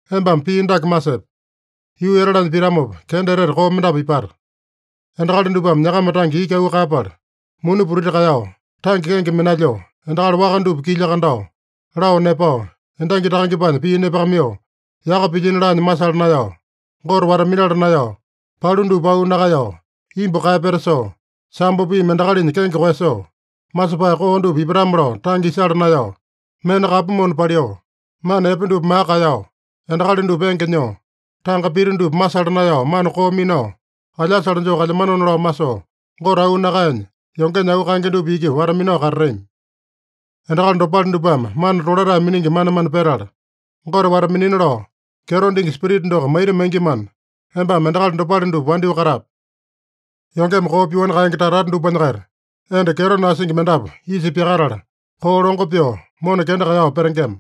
Embame pii dake masepe: Yuu etalanya pitamopa, kenda etete koo mendapu ipata. Endakali dupame nyakama tange iki auu kaeyapala, muni putiti kaeyao, tange kenge minalyoo, endakali waka dupa kilya kandao, lao nepao, endangi takangepanya pii nepakamaiyoo, yaka pilyino laanya masala naeyao, Gote wata-minala naeyao, palu dupa auu nakaeyao, imbu kaeyapeta soo, sambo piimi endakalinya kenge koeyasoo, masepae koo dupa ipatame-lao tange isala naeyao, mena kapu mona paliu, mana epe dupa maka kaeyao, endakali dupa enge nyoo, tanga pita dupa masala naeyao mana koo minao, alyasale joo kalyamanona lao masoo, Gote auu nakaenya yongenya auu kaenge dupa iki wata-minao katatami. Endakali dopale dupame mana tolatae miningi manemane petala, Gote wata-minina lao kyeto dingi Spirita doko maita maingimana, embame endakali dopale dupa wandyoo katape. Yongeme koo pyoani kaenge tata-tata dupanya-kaita enda kyeto nasingi mendapu isa pyakatala, koo longo pyoo, mona kenda kaeyao petengema.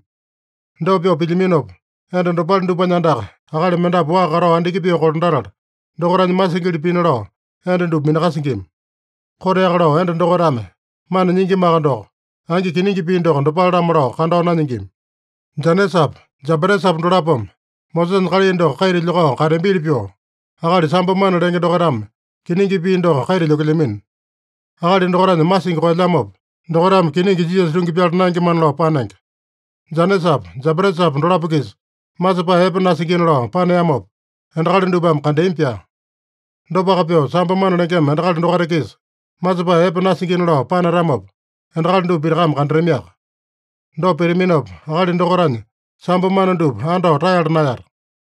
Dopa pyoo pilyaminopa, enda dopale dupanya andaka akali mendapu waa katao andiki pyoo kolandatala, dokaitanya masingili pina lao enda dupa minakasingima. Koteaka lao enda dokaitame mana nyingimaka doko, angi kiningi pii doko dopale-lamo lao kandao nanyingima. Janesapa, Jambatesapa dolapome Mosesanya kalai doko kaita lyokao kateambili pyoo, akali sambo mana lenge dokaitame kiningi pii doko kaita lyokelyamino. Akali dokaitanya masingi koelyamopa, dokaitame kiningi Jisasa tungi pyala naengemana lao panenge. Janesapa, Jambatesapa dolapo-kisa masepae epe nasingina lao paneamopa, endakali dupame kandeami-pyaa. Dopaka pyoo, sambo mana lengema endakali dokaita-kisa masepae epe nasingina lao panatamopa, endakali dupa pitakame kandatamiaka. Dopa pitaminopa, akali dokaitanya sambo mana dupa andao taeyala naeyata.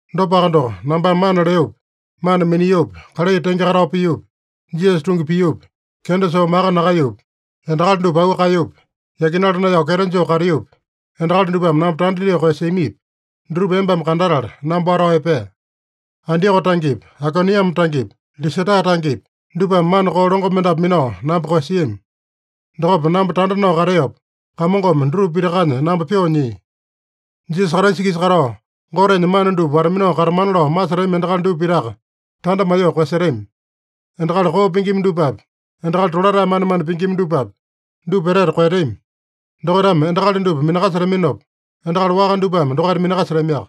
Dopaka doko, nambame mana leopi, mana miniopi, kalai tenge katao piopi, Jisasa tungi piopi, kenda soo maka nakaeyopi, endakali dupa auu kaeyopi, yakinala naeyao kyeto joo kateopi, endakali dupame namba tanda dyoo koeyasiamipi, dutupa embame kandatala, namba watao epee. Antioko tangepi, Aikoniame tangepi, Lisata tangepi, dupame mana koo longo mendapu minao namba koeyasiami. Dokopa namba tanda nao kateopa, Kamongome dutupa pitakanya namba pyoo nyia. Jisasa Kraisa-kisa katao, Gotenya mana dupa wata-minao katamana lao masetami endakali dupa pitaka, tanda maiyoo koeyasetami. Endakali koo pingima dupapi, endakali tolatae manemane pingima dupapi, dupa etete koeyatami. Dokaitame endakali dupa minakasetaminopa, endakali waka dupame dokaita minakasetamiaka.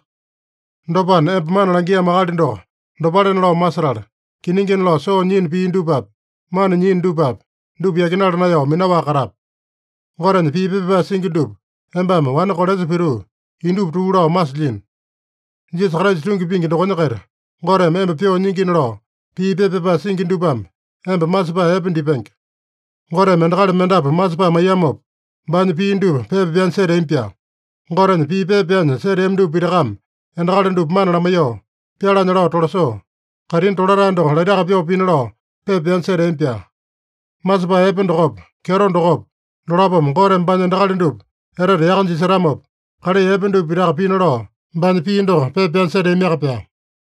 Dopana, emba mana langiamo akali doko dopalena lao masetala, kiningina lao soo nyiino pii dupapi, mana nyiino dupapi, dupa yakinala naeyao minaowaka katape. Gotenya pii pepa pyapae singi dupa embame wane kolesa pituu, indupa tuu lao masilyino. Jisasa Kraisa tungi pingi dokonya-kaita Goteme emba pyoo nyingina lao, pii pepa pyapae singi dupame emba masepae epe dipenge. Goteme endakali mendapu masepae maiyamopa, baanya pii dupa pepa pyanya seteami-pyaa. Gotenya pii pepa pyanya seteami dupa pitakame endakali dupa mana lamaiyoo, pyalanya lao tolasoo, kaitini tolatae doko laitaka pyoo pina lao pepa pyanya seteami-pyaa. Masepae epe dokopa, kyeto dokopa, dolapome Goteme baanya endakali dupa etete yaka jisetamopa, kalai epe dupa pitaka pina lao, baanya pii doko pepa pyanya seteamiaka-pyaa.